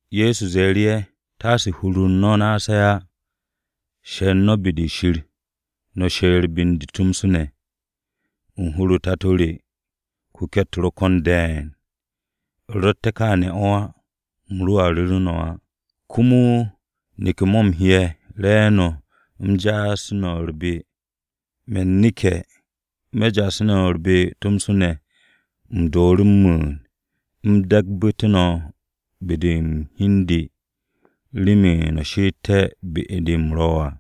Ye̱so ze̱e̱ru̱ ye̱. “Taase hur-u̱r no̱ naase̱ á. She̱r no̱ be-de Shir. No̱ she̱r be u̱n de tomso ne̱. U̱n hur-o Tato re kuke̱-u̱t ro̱ ko̱n de̱e̱n. U̱ rotte̱ kááne̱ o̱ á, u̱m roa ru̱ru̱ no̱ á. Komo neke̱-mo̱ u̱m he'e̱ re̱e̱no̱ u̱m ja'asu̱té̱ no̱ u̱r-be. Me̱n neke̱, me̱ ja'asu̱nse̱ no̱ u̱r-be tomso ne̱, u̱m dooru̱ m-mu̱u̱n u̱m de̱gbu̱té̱ no̱ u̱n be-de u̱n hi u̱n de remen no̱ she'etté̱ be-de u̱m ro̱ à.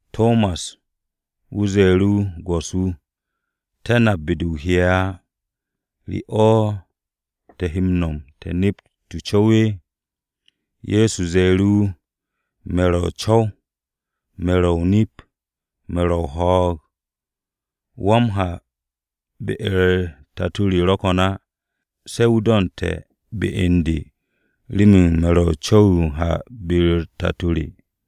Tomas ze̱e̱ru̱ wu̱, “Go̱s-wu̱, te̱ nap be-de o he'e̱ á. ¿Re o̱ te̱ he m-no̱m te̱ nept o-co̱w?” Ye̱so ze̱e̱ru̱ wu̱, “Me̱ wu̱ ro̱ o-co̱w, me̱ wu̱ ro̱ o-nip, me̱ wu̱ ro̱ ho̱o̱g. Wa m-ha be-u̱r Tato re ro̱ ko̱n á, se̱ wu̱ do̱nte̱ be u̱n de remen me̱ wu̱ ro̱ o-co̱w yo m-ha be-u̱r Tato re.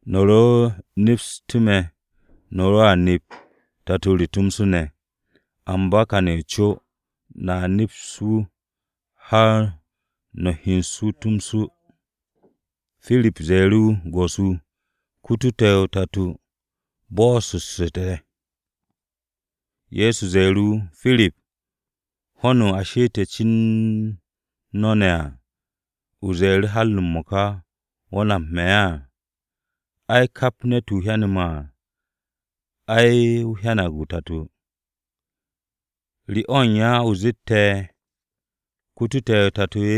No̱ ro nepstu̱ me̱, no̱ roa nep Tato re tomso ne̱. Amba kane̱ u̱n co, no̱a neps wu̱ har no̱ hyen wu̱ tomso.” Pirip ze̱e̱ru̱ wu̱, “Go̱s-wu̱, kutu̱ te̱ o-Tato. Bo̱'o̱ssu̱tu̱ te̱.” Ye̱so ze̱e̱ru̱ wu̱, “Pirip, ho̱nu̱ a she'ete̱ no̱ cen no̱ ne̱ à, ¿o ze̱e̱ru̱ har m-mo̱ka wo̱ nap me̱ á? Ai, kap ne̱t-wu̱ hyane̱ me̱ à, ai wu̱ hyanag o-Tato. ¿Re o̱ u̱n ya o zette̱, ‘Kute̱ te̱ o-Tato’?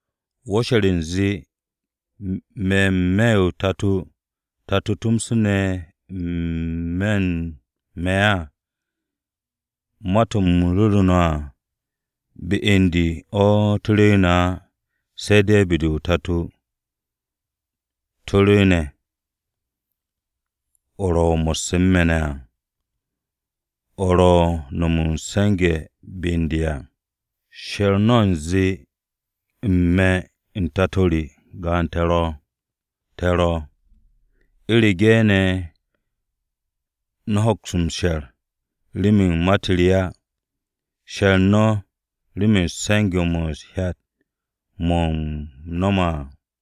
¿Wo̱ she̱r u̱nze me̱ n-me̱ o-Tato, o-Tato tomso ne̱ n-me̱ u̱n me̱ á? Ma-to̱ u̱m ru̱ru̱ no̱ à, be u̱n de o̱ to̱ rwu̱u̱ne̱ á, se̱ de̱ be-de o-Tato o̱ to̱ rwu̱u̱ne̱, o̱ ro̱ mo̱sse̱ n-me̱ ne̱ à, o̱ ro̱ m-no̱m m-se̱nge̱ be u̱n de à. She̱r u̱nze u̱n me̱ u̱n Tato re, gaan-to̱ te̱ ro̱. U̱rege̱ ne̱ no̱ hoks m-she̱r, remen ma-u̱t re á, she̱r no̱ remen se̱nge̱-mo̱ u̱t-hyat mo̱ u̱m no̱me̱ à.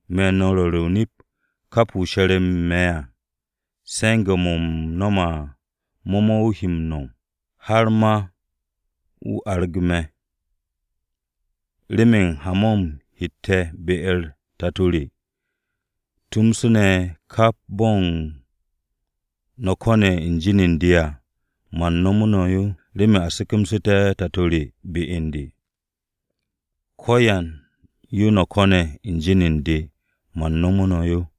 Me̱ no̱ m-ru̱re̱ o-nip, kap wu̱ she̱re̱ u̱n me̱ à, se̱nge̱-mo̱ me̱ m-no̱m à, mo̱ mo̱ wu̱ he m-no̱m. Har ma wu̱ arag me̱, remen ha-mo̱ u̱m hette̱ be-u̱r Tato re. Tomso ne̱ kap bo̱n yo no̱ ko̱ne̱ u̱n jin u̱n de à, man nomo no̱ yo remen a se̱ke̱msu̱té̱ Tato re be u̱n de. Ko̱yan yo no̱ ko̱ne̱ u̱n jin u̱n de, man nomo no̱ yo.”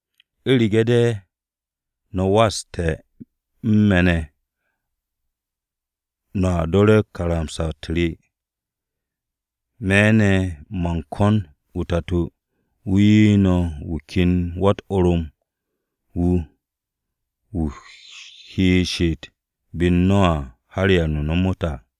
“U̱rege̱ de̱ no̱ waste̱ u̱n me̱ ne̱, no̱a do̱re̱ karamsa-u̱t re. Me̱ ne̱, man kon o-Tato, wu̱ 'ye no̱ wu̱ ken Wa-u̱t-Orom wu̱ wu̱ he m-she'et be u̱n no̱ har da-o̱ ba m-ta à.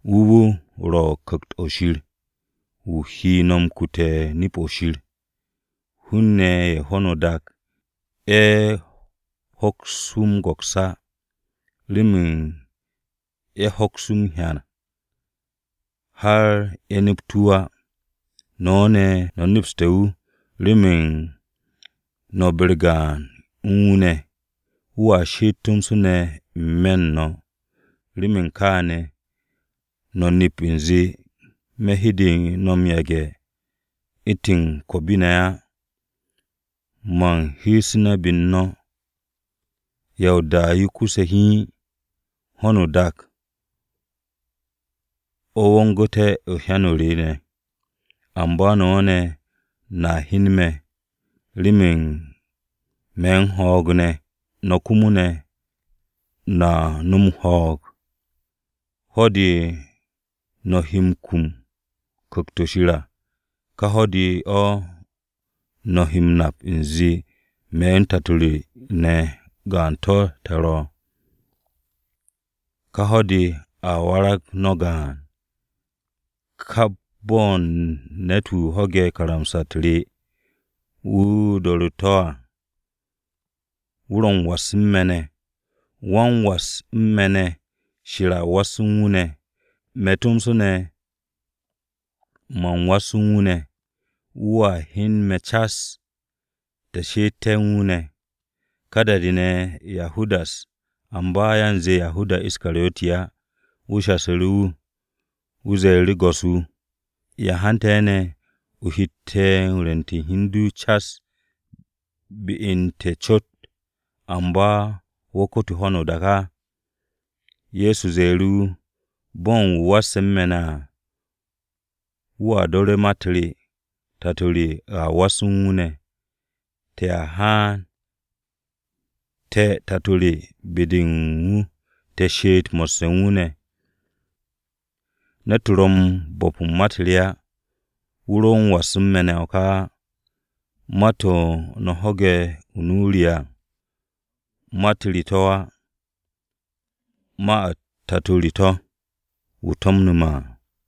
Wu̱ wu̱ ro̱ Ku̱kt-o̱ Shir wu̱ he no̱ m-kute̱ nip-o̱ Shir. Hun-ne̱ ye̱ u̱n ho̱no o-dak, ye̱ hoks wu̱ m-go̱ks á, remen ye̱ hoks wu̱ m-hyan, har ye̱ nept wu̱ á. No̱ ne̱, no̱ nepste̱ wu̱ remen no̱ be-u̱r gaan u̱n wu̱ ne̱. Wu̱a she'et tomso ne̱ n-me̱ u̱n no̱. Remen kááne̱, no̱ nep u̱nze me̱ hede no̱ m-yage̱ u̱ntu̱n ko̱o̱bi-ne̱ á. Man heesu̱ne̱ be u̱n no̱. Ya o-da yo kuse̱ hiin, ho̱no o-dak o̱ wongu̱te̱ u̱n hyan-o re ne̱. Amba no̱ ne̱, no̱a hyen me̱, remen me̱ u̱n ho̱o̱g ne̱, no̱ komo, no̱a nom ho̱o̱g. Ho̱-de, no̱ he kum u̱n Ku̱kt-o̱ Shir à, ka ho̱-de o̱ no̱ he m-nap u̱nze me̱ u̱n Tato re ne̱ gaan-to̱ te̱ ro̱. Ka ho̱-de a warag no̱ gaan. Kap bo̱n ne̱t-wu̱ ho̱ge̱ karamsa-u̱t re, wu̱ do̱ru̱ to̱ à, wu̱ ro̱ wan-m-was u̱n me̱ ne̱. Wan-m-was u̱n me̱ ne̱ ne̱, Shir a was u̱n wu̱ ne̱. Me̱ tomso ne̱, man was u̱n wu̱ ne̱. Wu̱a hyen me̱ cas, te̱ she'ette̱ u̱n wu̱ ne̱.” Ka da-de Yahudas (amba yanze Yahudas Iskariyoti á) wu̱ shasu̱ru̱ wu̱. Wu̱ ze̱e̱ru̱, “Go̱s-wu̱, ¿ya hante̱ ne̱ o hette̱ rwu̱nte̱ u̱n hi u̱n du cas be u̱n te̱ cot, amba wo̱ kute̱ ho̱no o-dak á?” Ye̱so ze̱e̱ru̱ wu̱, “Bo̱n wu̱ wasse̱ u̱n me̱ ne̱ à, wu̱a do̱re̱ ma-u̱t re. Tato re a was u̱n wu̱ ne̱. Te̱a haan, te̱ Tato re be-de u̱n wu̱ te̱ she'et mo̱sse̱ u̱n wu̱ ne̱. Ne̱t-wu̱ ro̱ u̱n bo̱p u̱n ma-u̱t re á, wu̱ ro̱ m-was u̱n me̱ ne̱ o̱ ka á. Ma-to̱ no̱ ho̱ge̱ u̱n nu-o re à, ma-u̱t re to̱ á. Ma-u̱t Tato re to̱, wu̱ to̱mnu̱ me̱ à.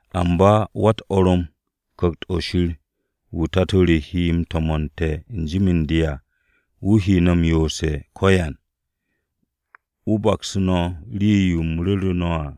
Amba Wa-u̱t-Orom, Ku̱kt-o̱ Shir wu̱ Tato re he m-to̱mo̱n u̱n jin u̱n de à, wu̱ he no̱ yoose̱ u̱n ko̱yan, wu̱ baksu̱ no̱ rii-yo u̱m ru̱ru̱ no̱ à.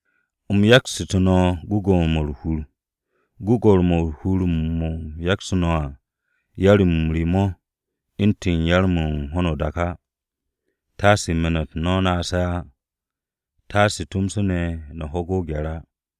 U̱m yaksu̱tu̱ no̱ gwu̱gwu̱-mo̱ u̱r-hur. Gwu̱gwu̱-mo̱ u̱r-hur mo̱ u̱m yaksu̱ no̱ à, yar-m re mo̱ u̱ntu̱n yar-mo̱ u̱n ho̱no o-dak á. Taasu̱ me̱n-u̱t no̱ naase̱ á, taasu̱ tomso ne̱ no̱ ho̱ge̱ o-gye̱r á.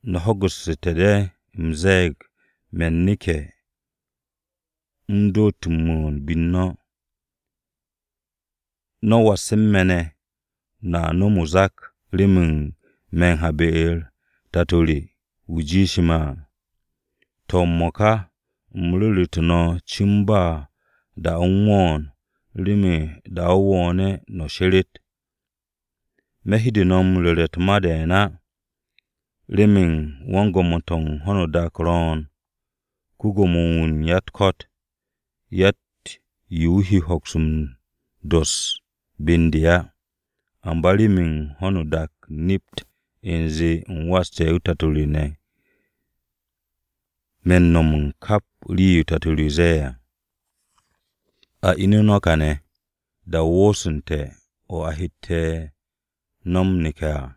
“No̱ ho̱gu̱ssu̱te̱ de̱ u̱m ze̱e̱g me̱n neke̱ u̱m dott m-mu̱u̱n be u̱n no̱. No̱ wasse̱ u̱n me̱ ne̱, no̱a nom o-zak remen me̱ m-ha be-u̱r Tato re wu̱ jiishe̱ me̱ à. To̱, m-mo̱ka u̱m ru̱ru̱tu̱ no̱ cin ba da-o u̱n wo̱o̱n remen da-o wo̱o̱ne̱ no̱ she̱re̱t. Me̱ hede no̱ m-ru̱re̱ u̱t-ma de̱e̱n á, remen wan-gwo̱mo-to̱ u̱n ho̱no o-dak ro̱o̱n, ko-Gwo̱mo-wu̱ u̱n ya-u̱t-ko̱t. Yatt-yo wu̱ he ne̱ hoks m-dos be u̱n de á. Amba remen ho̱no o-dak nept u̱nze u̱m waste̱ o-Tato ne̱, me̱ u̱n no̱m u̱n kap rii-yo Tato re ze̱e̱ à. “A ine̱ no̱ kane̱, da-o wooste̱ o̱ a hette̱ no̱ m-neke̱ à.”